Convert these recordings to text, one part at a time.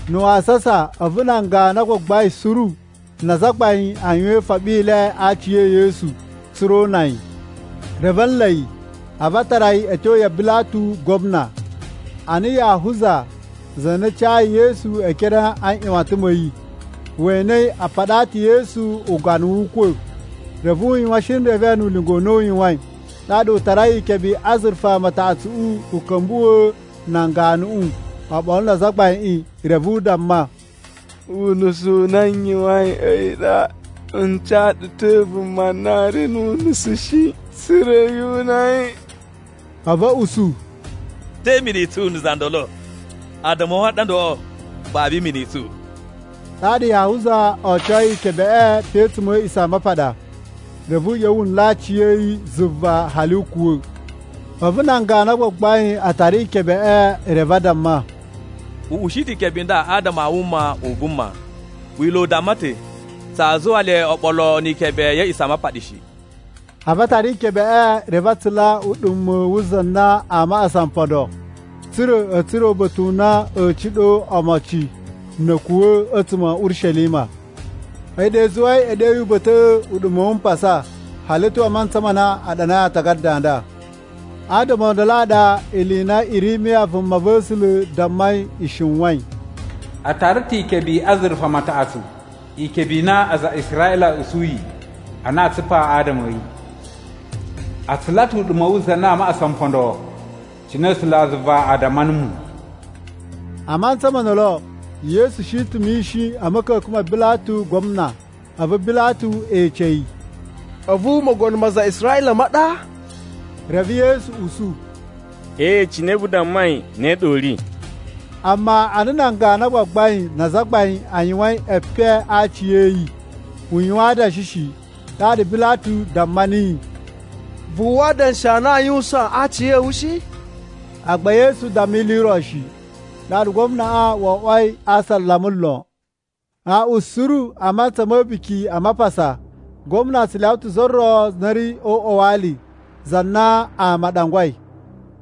Na̱ wasasa, a̱vu nan ganu a gbagbain suru na azagbain a yuwan ifoɓi i le a aci e Yesu tsa̱ra̱ o una yi. Reve a̱ nla̱ yi a̱vu a tara yi a̱ tyo ya Bilatu Gwamna. Ana Yahuza, za na cayi Yesu e ekere a nꞌyuwatan ma̱ yi, we enei a paɗaa ta̱ Yesu ugana wu ukwa̱, reve u yuwan shinreve nu ulinga u na u yuwain. Ɗaɗa u tarai ikebe i azurufa mataꞌatsuꞌu u ka̱mbuwa̱a̱ nan ganuꞌu oɓolo na azagbaiꞌin. Reve u damma, “Unusu u na n yuwain a̱yi ɗa: N ca ɗu ta̱ vuma na ri nu unusu shi tsa̱ra̱ yu una yi.” A̱vu a̱ usu, “To, te imini i tsu na̱ za ndolo? Addama a̱ wu a ɗa ndoloꞌo, babu imini i tsu.” Ɗaɗa Yahuza ocoi ikebeꞌe pe a̱tsuma̱ a̱ A̱a̱ꞌisamapaɗa. Reve u ꞌya̱wa̱ wu nla̱ aciya̱yi zuva hali u kuwa̱. A̱vu nan ganu a gbagbain a tara ikebeꞌe reve a damma, “U ushi ta̱ ikebe i nda adama a wuma u vuma. Wila̱ u damma ta̱ tsaa zuwa le oɓolo ni ikebe ya̱ A̱a̱ꞌisamapaɗa shi.” A̱vu a tara ikebeꞌe reve a tsula uɗuma̱ wu za na a maꞌasa mpondo, tsa̱ra̱ a̱ tsura̱ uba̱ta̱ u na a̱a̱ ciɗo omocin na̱ a̱ kuwa̱ a̱tsuma̱ a̱ Urishelima. A̱yi ɗa i zuwai e ɗeyi uba̱ta̱ꞌa̱, “Uɗuma̱ wu Mpasa” hali a̱ tyo a mantsa ma na a ɗanai aatagada a nda. Adama o ndolo a ɗa ili i na Irimiya vumava̱sula̱ dammai i shiwain: “A tara ta̱ ikebe i azurufa mataꞌatsu, ikebe i na aza a Israꞌila a̱ usuyi a na aa tsupa adama a̱ yi. A tsula ta̱ uɗuma̱ wu za na a maꞌasa mpondo cine A̱sulazuva a damma numu.” A mantsa mo ndolo, Yesu shi ta̱ mishin a̱ ma̱ka̱ka̱n ma Bilatu Gwamna, a̱vu Bilatu ece yi, “A̱vu mogono ma aza a Israꞌila ma ɗa?” Reve Yesu usu, “Ee, cine vu dammai ne ɗa u ri.” Amma ana nan ganu a gbagbain na azagbain a yuwain epen a aci a̱ yi, u yuwan adanshi shi. Ɗaɗa Bilatu damma niyi, “Vu uwwa adanshi a na aa yuwusaan a aci a̱ wu shi?” Agba Yesu damma ili i ro shi, ɗaɗa gwamnaꞌa wo oꞌwoi a asalama lon. Aaꞌwan suru a mantsa ma̱ A̱buki a Mapasa, gwamna tsu lyawa ta̱ za ro na ri o uꞌwa wa ali, za na ama a ɗangwai.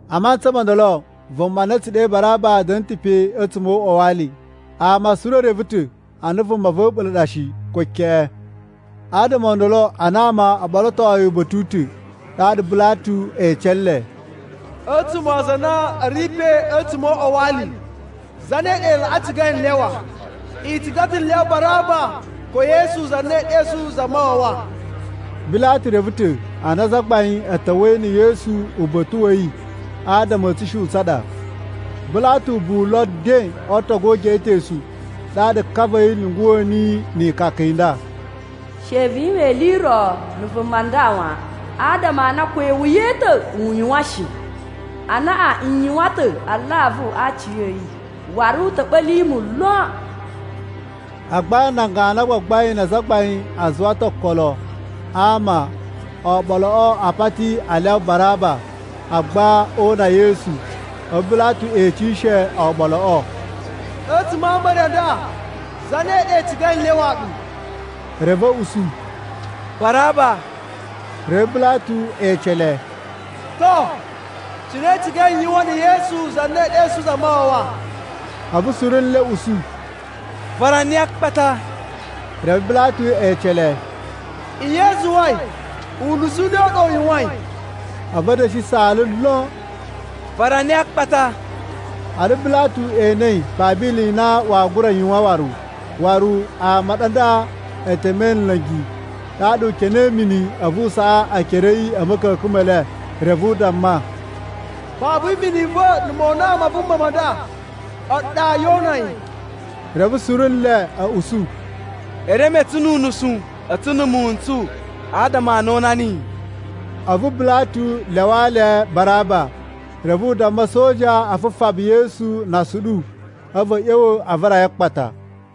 A mantsa mo ndolo, vuma na a̱ tsu ɗe Baraba da̱na̱ ta̱ pe a̱tsuma̱ o uꞌwa wa ali. Ama suru e reve ta̱ a na vuma va̱ a̱ɓula̱ ɗa shi, ko keꞌen. Adama o ndolo ana ama o ɓolotoi uba̱ta̱ u ta̱, ɗaɗa Bilatu ece nle, “A̱tsuma̱ aza a na a̱ ri pe a̱tsuma̱ o uꞌwa wa ali, zane ɗa i laꞌa cigai n lyawa? I ciga ta̱ n lyawa Baraba ko Yesu za na ee ɗesu Zamawawa?” Bilatu reve ta̱ a na azagbain a̱ ta̱wa̱i na̱ Yesu uba̱ta̱ wa̱ yi adama a̱ tsushuꞌun tsa ɗa. Bilatu ubuwu lo nden o ootogu o ugeꞌetosu, ɗaɗa ka va̱ yi lyunguwa̱ niyi ikaka i nda: “She vu yuwan ili i ro na̱ vuma nda wan, adama a na ko iwuya i ta̱ u yuwan shi. Anaꞌan n yuwan ta̱ alavu a aci a̱ yi, waru u ta̱ ɓa̱li mu lon.” Agba nan ganu a gbagbain na azagbain a zuwa ta̱ okolo a ama o oɓoloꞌo a pati a lyawa Baraba, agba o una Yesu. A̱vu Bilatu ecishe oɓoloꞌo, “A̱tsuma̱ a ama e re a nda, zane ɗa i cigai n lyawaa ɗu?” Reve a̱ usu, “Baraba.” Reve Bilatu ece le, “To, cine i cigai n yuwan na̱ Yesu, za na ee ɗesu Zamawawa?” A̱vu suru nle a̱ usu, “Vara niyi a akpata.” Reve Bilatu ece le, “Nye i zuwai? Unusu u ne u ɗa u yuwain?” A̱vu a̱ da̱shi saala lon, “Vara niyi akpata!” Ana Bilatu enei babu ili i na waa gura yuwan waru, waru ama a ɗa nda e temei nla̱ngi. Ɗaɗa u kenei mini a̱vu u saꞌa ekere a̱ yi a̱ ma̱ka̱ka̱n me le reve u damma, “Babu imini i va̱ na̱ mona ma vuma nda, a̱ɗu ɗa yoo una yi.” Reve suru nle a̱ usu, “E reme tsu nu unusu a̱tsu na̱ muwun n tsu adama a na o una niyi.” A̱vu Bilatu lyawaa le Baraba. Reve u damma a̱soja a fufaba Yesu na asuɗu, a̱vu a̱ ꞌya̱wa̱ a vara yi a akpata.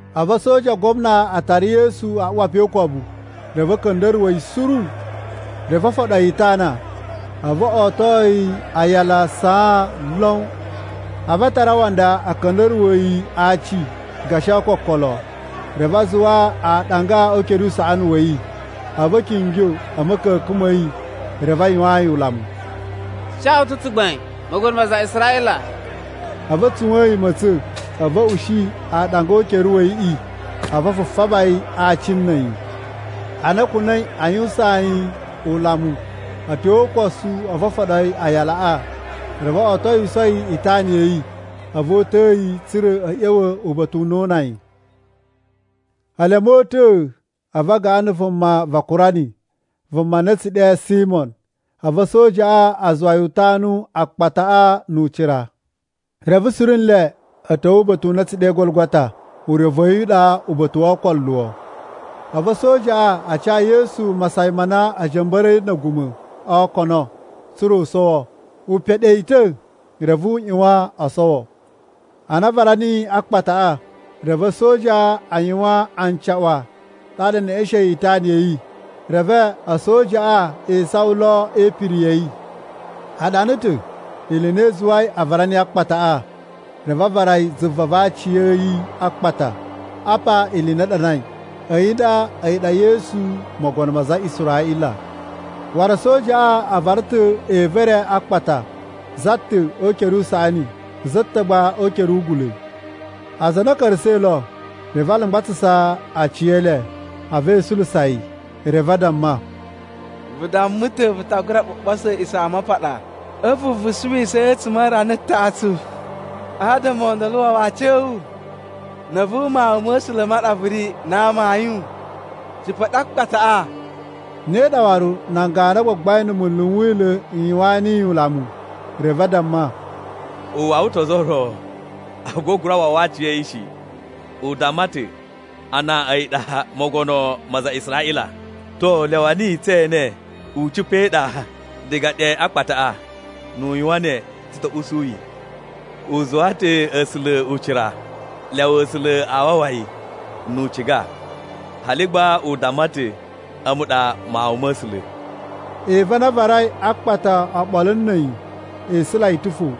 A̱vu a̱soja a gwamna a tara Yesu a uwa pe o ukobu, reve a̱ ka̱nda̱ruwa̱ yi suru. Reve o foɗo yi itana, a̱vu o oto yi aayala a saan lon. A̱vu a tara awanda a̱ ka̱nda̱ruwa̱a̱ yi a aaci gashi ookokolo. Reve a zuwa aaɗanga o ukere usaꞌani wa̱ yi, a̱vu a̱ kingyo a̱ ma̱ka̱ka̱n ma̱ yi reve a yuwaan yi ulamu, “Tsu ca wu ta̱ tsugbain, mogono ma aza a Israꞌila.” A̱vu a tsuwa̱a̱n yi ma̱tsa̱n. A̱vu a̱ ushi aaɗanga o ukere wa̱ yiꞌi, a̱vu a fufaba yi a aaci na̱ a̱yi. Ana a̱ kuna̱i a yuwusaan yi ulamu a̱ tyo o ukosu, a̱vu o foɗo yi aayalaꞌa, reve otowiso yi itana ya̱ yi. A̱vu o uta̱a̱ yi tsa̱ra̱ a̱ ꞌya̱wa̱ uba̱ta̱ u na oo una yi. Ele a̱ mota̱a̱, a̱vu a gaꞌan na̱ vuma va Kurani, vuma na a̱ tsu ɗe Simo. A̱vu a̱sojaꞌa a zuwa yi u tanu akpataꞌa nu ucira. Reve suru nle a̱ ta̱wa̱ uba̱ta̱ u na a̱ tsu ɗe Gologota (urevu wa̱ yi u ɗa Uba̱ta̱ wo Ookoluwo.) A̱vu a̱sojaꞌa a ca Yesu masayan ma na a̱ ja̱mba̱ra̱i na̱ a̱guma̱ o okono tsa̱ra̱ u sowo. U peɗe yi ta̱ reve u ꞌyuwan o sowo. Ana a vara niyi a akpataꞌa, reve a̱soja a yuwan ancaꞌwa ɗaɗa e neꞌeshein itana ya̱ yi. Reve a̱sojaꞌa e isawan lo e ipiri ya̱ yi. A ɗana ta̱ ili i na i zuwai a vara niyi akpataꞌa, reve a vara yi zuva va aaci a̱ yi a akpata. Apa ili i na a ɗanai: A̱yi nda, a̱yi ɗa Yesu mogono ma aza a Israꞌila. Waru a̱sojaꞌa a vara ta̱ evu e re a akpata, za ta̱ o ukere usaꞌani, za ta̱ gba o ukere ugula̱. Aza a na a̱ ka̱ra̱sa̱ lo, reve a lumgbatsasa aci e le a̱vu e isula yi. Reve a damma, “Vu damma ta̱ vu ta gura ɓuɓoso A̱a̱ꞌisamapaɗa, a̱vu vu suwisa yi a̱tsuma̱ a rana taꞌatsu. Adama o ndolo wawa aciya̱wu! Na̱ a̱vu Mawun ma̱ A̱sula̱ ma ɗa vu ri na amayun, cipa̱ ɗe a akpataꞌa!” Ne ɗa waru nan ganu a gbagbain na̱ munlu n Wila̱ n yuwaan niyi ulamu. Reve a damma, “U wawa ta̱ ozo o ro, agba u gura wawa aciya̱yi shi! U damma ta̱ a na a̱yi ɗa mogono ma aza a Israꞌila. To, lyawa niyi tse ene u cipa̱ e iɗa diga ɗe a akpataꞌa. Nnu u yuwan ne tsu ta̱ usu yi. U zuwaa ta̱ A̱sula̱ ucira, lyawa A̱sula̱ a wawa yi, nu u ciga. Hali gba u damma ta̱, ‘A̱mu ɗa Mawun ma̱ A̱sula̱.’” Evu a na a varai a akpata oɓolo na̱ a̱yi e isula yi ta̱ fo.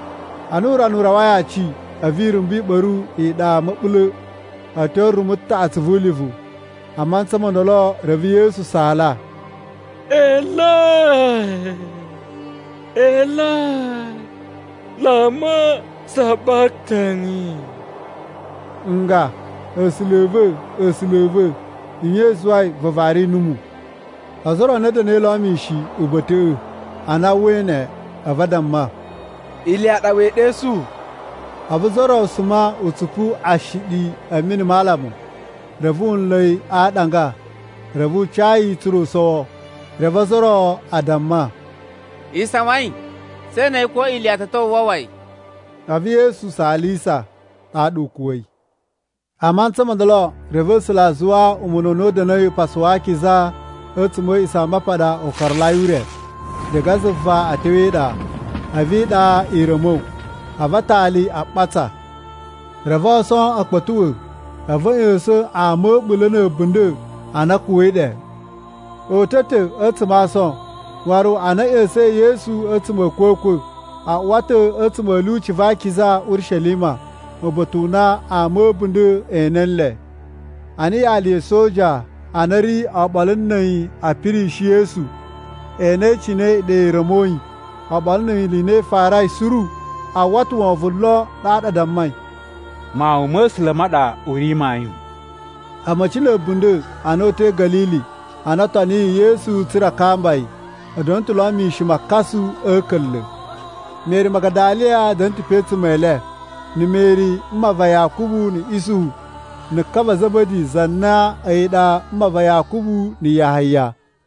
Ana urana u rawai aci, a̱vu irumbu i ɓa̱ru iɗa ma̱ɓula̱ a̱ tyo rumu taꞌatsu vu ulivu. A mantsa mo ndolo, reve Yesu saala, “Eloi, Eloi, lama sabaktani,” nga, “A̱sula̱ a̱ va̱, A̱sula̱ a̱ va̱, nye i zuwai vu vari numu?” Ozo o ro a na a̱ da̱na̱i lo mishin uba̱ta̱ꞌa̱, ana a uwwai ne, a̱vu a damma, “Iliya ɗa wee ɗesu!” A̱vu za ro suma u tsupu ashiɗi a̱ mini ma alamu, reve wu nla̱ yi a aaɗanga reve u cayi tsa̱ra̱ u sowo. Reve ozo o ro a damma, “Isawain, tse enei ko Iliya ta̱ ta̱wa̱ u wawa yi!” A̱vu Yesu saalisa, ɗaɗa u kuwa̱i. A mantsa mo ndolo, reve A̱sula̱ a zuwa umuna u na u da̱na̱i Upasu wa Akiza a̱tsuma̱ a̱ A̱a̱ꞌisamapaɗa u karalai ure, diga zuva a̱ tyo e iɗa. A̱vu iɗa i ra̱mo, a̱vu atali a ɓatsa. Reve ason a̱ kpa̱tuꞌwa̱, a̱vu a̱ ꞌya̱sa̱n ama a̱ a̱ɓula̱ na̱ a̱bunda̱ a na a̱ kuwa̱i ɗe. O uta̱ ta̱ a̱tsuma̱ a ason, waru ana a̱ ꞌya̱sa̱in Yesu a̱tsuma̱ a̱ a̱kwa̱kwa̱, a uwa ta̱ a̱tsuma̱ a̱ lyuci va akiza, Urishelima, uba̱ta̱ u na ama a̱ a̱bunda̱ e ene nle. Ana yali na̱ a̱soja a na a̱ ri oɓolo na̱ a̱yi a̱ pirishi Yesu e enei cine iɗa i ra̱moi, oɓolo ni ili i na i farai suru, a uwwa ta̱ wovon lon. Ɗaɗa a dammai, “Mawun ma̱ A̱sula̱ ma ɗa u ri mayun!” A̱ma̱ci na̱ a̱bunda̱ a na o uta̱i Ga̱lili a na o toniyi Yesu tsa̱ra̱ a kamba yi, a̱ da̱na̱ ta̱ lo mishin makasu a̱ a̱ka̱nla̱. Meri Magadaliya da̱na̱ ta̱ pe a̱tsuma̱ e le, na̱ Meri mma va Yakubu na̱ Isuhu, na̱ ka va Za̱ba̱di za na a̱yi ɗa mma va Yakubu na̱ Yahaya.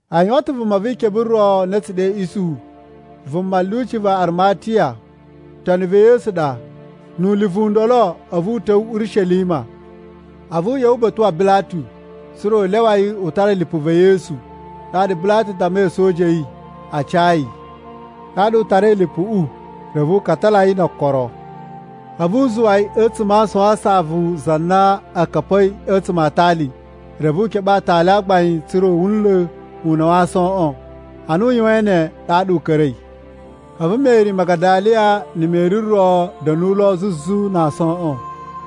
A yuwan ta̱ vuma vi ikebe ro na a̱ tsu ɗe Isuhu, vuma lyuci va Arimatiya. Toni va̱ Yesu ɗa. Nu ulivu u ndolo a̱vu u ta̱wa̱ Urishelima. A̱vu u ꞌya̱wa̱ uba̱ta̱ wa Bilatu, tsa̱ra̱ u lyawa yi u tara lipu va̱ Yesu. Ɗaɗa Bilatu dammai a̱soja a̱ yi a ca yi. Ɗaɗa u tarai lipuꞌu, reve u katala yi no okoro. A̱vu u zuwa yi a̱tsuma̱ a aason a saꞌavu za na u ka̱pa̱i a̱tsuma̱ a aatali. Reve u keɓe aatali a gbain tsa̱ra̱ u ula una̱ wa aasoꞌon. Ana u yuwain ne ɗaɗa u ka̱ra̱i. A̱vu Meri Magadaliya na̱ Meri ro a̱ da̱nu lo zuzu na aasoꞌon.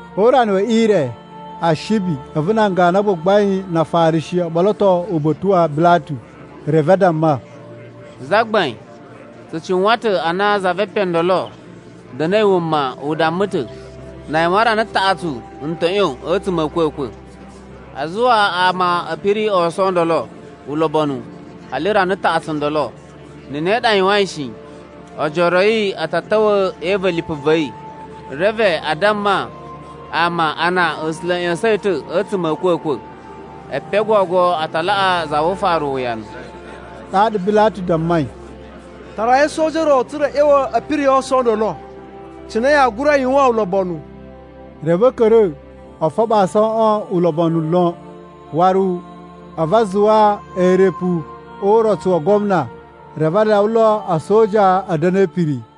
O urana we ire, Ashibi, a̱vu nan ganu a gbagbain na Afarishi o ɓoloto uba̱ta̱ wa Bilatu. Reve a damma, “Zagbain, tsu cuwan ta̱ ana za ve epen o ndolo da̱na̱i wuma u damma ta̱, ‘Na a yuwan rana taꞌatsu n ta̱ ꞌyon a̱tsuma̱ a̱ a̱kwa̱kwa̱.’ A zuwa ama a̱ piri aason o ndolo ulobonu hali rana taꞌatsu ndolo. Na̱ ne ɗa a yuwain shi, ojoro a̱ yi a̱ ta̱ ta̱wa̱ e iva̱ lipu va̱ yi, reve a damma ama a na A̱sula̱ a̱ ꞌya̱sa̱n yi ta̱ a̱tsuma̱ a̱ a̱kwa̱kwa̱. Epen o gogo a ta laꞌa za vu ufaru uwuyanu.” Ɗaɗa Bilatu dammai, “Tarai a̱soja o ro tsa̱ra̱ a̱ ꞌya̱wa̱ a̱ piri aason o ndolo cine yaa gura yuwan ulobonu.” Reve a̱ ka̱ra̱ o foɓo aasoꞌon ulobonu lon, waru a̱vu a zuwa eerepu o urotsu wa gwamna, reve a lyawa lo a̱soja a̱ da̱na̱ e ipiri.